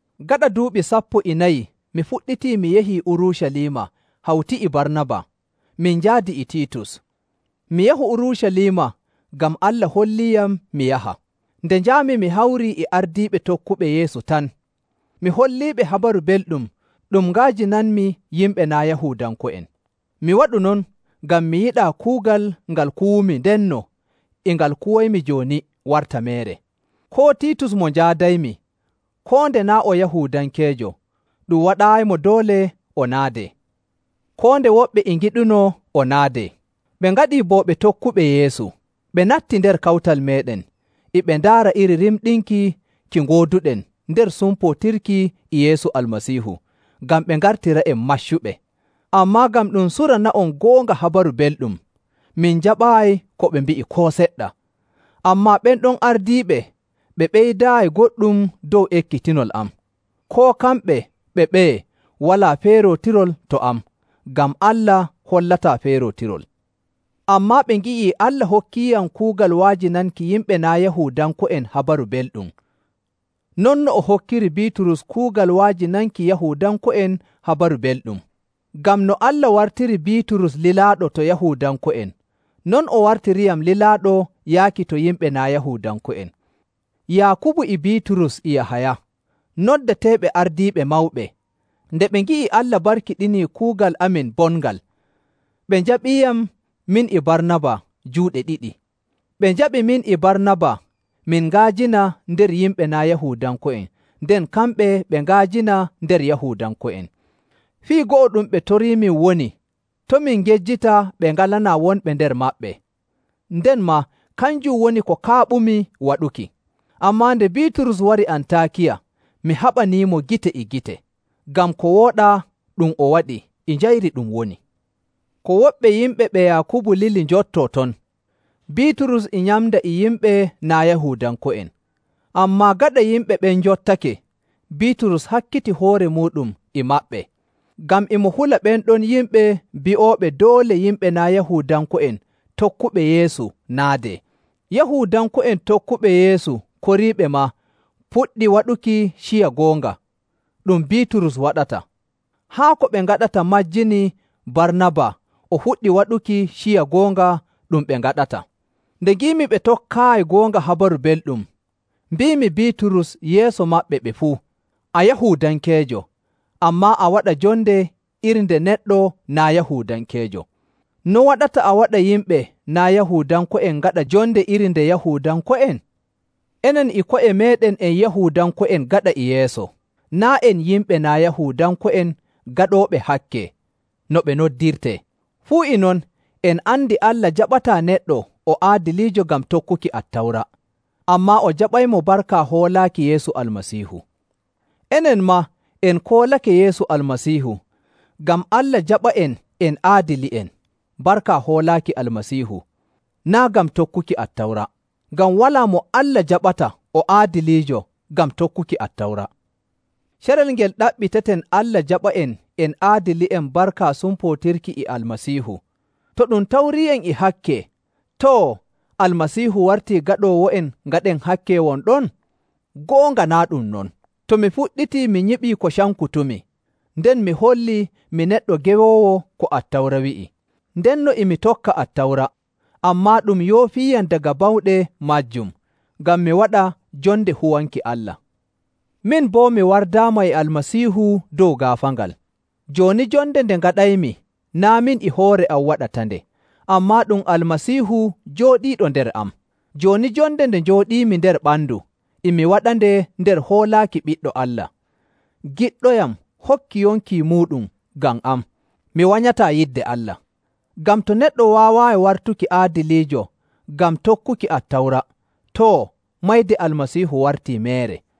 Gaɗa duuɓi sappo e nayi mi fuɗɗiti mi yahii Urucaliima hawti e Barnaba, min njaadi e Tiitus. Mi yahu Urucaliima ngam Allah holliiyam mi yaha. Nde njaami mi hawrii e ardiiɓe tokkuɓe Yeesu tan, mi holliiɓe Habaru Belɗum ɗum nga'ajinanmi yimɓe naa' Yahuudanko'en. Mi waɗu non ngam mi yiɗaa kuugal ngal kuwumi ndenno e ngal kuwaymi jooni warta meere. Koo Tiitus mo njaadaymi, koo nde naa' o Yahuudankeejo, ɗum waɗaayimo doole o naadee, koo nde woɓɓe e ngiɗunoo o naadee. Ɓe ngaɗii bo ɓe tokkuɓe Yeesu, ɓe natti nder kawtal meeɗen, e ɓe ndaara iri rimɗinki ki ngooduɗen nder sumpootirki e Yeesu Almasiihu, ngam ɓe ngartira'en maccuɓe. Ammaa ngam ɗum surana'on goonga Habaru Belɗum, min njaɓaayi ko ɓe mbi'i koo seɗɗa. Ammaa ɓen ɗon ardiiɓe ɓe ɓeydaayi goɗɗum dow ekkitinol am. Koo kamɓe ɓe ɓeye walaa feerootirol to am, ngam Allah hollataa feerootirol. Ammaa ɓe ngi'i Allah hokkiiyam kuugal wa'ajinanki yimɓe naa' Yahuudanko'en Habaru Belɗum, non no o hokkiri Biiturus kuugal wa'ajinanki Yahuudanko'en Habaru Belɗum. Ngam no Allah wartiri Biiturus lilaaɗo to Yahuudanko'en, non o wartiriyam lilaaɗo yaaki to yimɓe naa' Yahuudanko'en. Yaakubu e Biiturus e Yahaya, noddeteeɓe ardiiɓe mawɓe, nde ɓe ngi'i Allah barkiɗinii kuugal amin bongal, ɓe njaɓɓiiyam min e Barnaba juuɗe ɗiɗi. Ɓe njaɓi min e Barnaba min nga'ajina nder yimɓe naa' Yahuudanko'en, nden kamɓe ɓe nga'ajina nder Yahuudanko'en. Fii go'o ɗum ɓe toriimin woni to' min ngejjita ɓe ngalanaa wonɓe nder maɓɓe, nden maa kanjum woni ko kaaɓumi waɗuki. Ammaa nde Biiturus wari Antaakiya, mi haɓaniimo gite e gite, ngam ko wooɗaa ɗum o waɗi e njayri ɗum woni. Ko woɓɓe yimɓe ɓe Yaakubu lili njottoo ton, Biiturus e nyamda e yimɓe naa' Yahuudanko'en. Ammaa gaɗa yimɓe ɓen njottake, Biiturus hakkiti hoore muuɗum e maɓɓe, ngam e mo hula ɓen ɗon yimɓe bi'ooɓe doole yimɓe naa' Yahuudanko'en tokkuɓe Yeesu naadee. Yahuudanko'en tokkuɓe Yeesu koriiɓe maa puɗɗi waɗuki ciya goonga ɗum Biiturus waɗata, haa ko ɓe ngaɗata majjini Barnaba o fuɗɗi waɗuki ciya goonga ɗum ɓe ngaɗata. Nde ngiimi ɓe tokkaayi goonga Habaru Belɗum, mbiimi Biiturus yeeso maɓɓe ɓe fuu, “A Yahuudankeejo, ammaa a waɗa jonde iri nde neɗɗo naa' Yahuudankeejo. No waɗata a waɗa yimɓe naa' Yahuudanko'en ngaɗa jonde iri nde Yahuudanko'en?” Enen e ko'e meeɗen en Yahuudanko'en gaɗa e yeeso, naa' en “yimɓe naa' Yahuudanko'en gaɗooɓe hakke,” no ɓe noddirtee. Fuu e non, en andi Allah jaɓataa neɗɗo o aadiliijo ngam tokkuki Attawra, ammaa o jaɓaymo barka hoolaaki Yeesu Almasiihu. Enen maa en koolake Yeesu Almasiihu ngam Allah jaɓa'en en aadili'en barka hoolaaki Almasiihu, naa' ngam tokkuki Attawra. Ngam walaa mo Allah jaɓata o aadiliijo ngam tokkuki Attawra. Carel ngel ɗaɓɓiteten Allah jaɓa'en en aadili'en barka sumpootirki e Almasiihu, to ɗum tawrii'en e hakke, too, Almasiihu wartii gaɗoowo'en ngaɗen hakke won ɗon? Goonga naa' ɗum non! To mi fuɗɗitii mi nyiɓii ko cankutumi, nden mi hollii mi neɗɗo gewoowo ko Attawra wi'i. Ndenno e mi tokka Attawra, ammaa ɗum yoofiiyam daga bawɗe maajum, ngam mi waɗa jonde huwanki Allah. Min bo mi wardaama e Almasiihu dow gaafaangal. Jooni jonde nde ngaɗaymi naa' min e hoore am waɗatande, ammaa ɗum Almasiihu jooɗiiɗo nder am. Jooni jonde nde njooɗiimi nder ɓandu, e mi waɗande nder hoolaaki Ɓiɗɗo Allah, giɗɗoyam hokki yonki muuɗum ngam am. Mi wanyataa yidde Allah. Ngam to neɗɗo waaway wartuki aadiliijo ngam tokkuki Attawra, too, mayde Almasiihu wartii meere.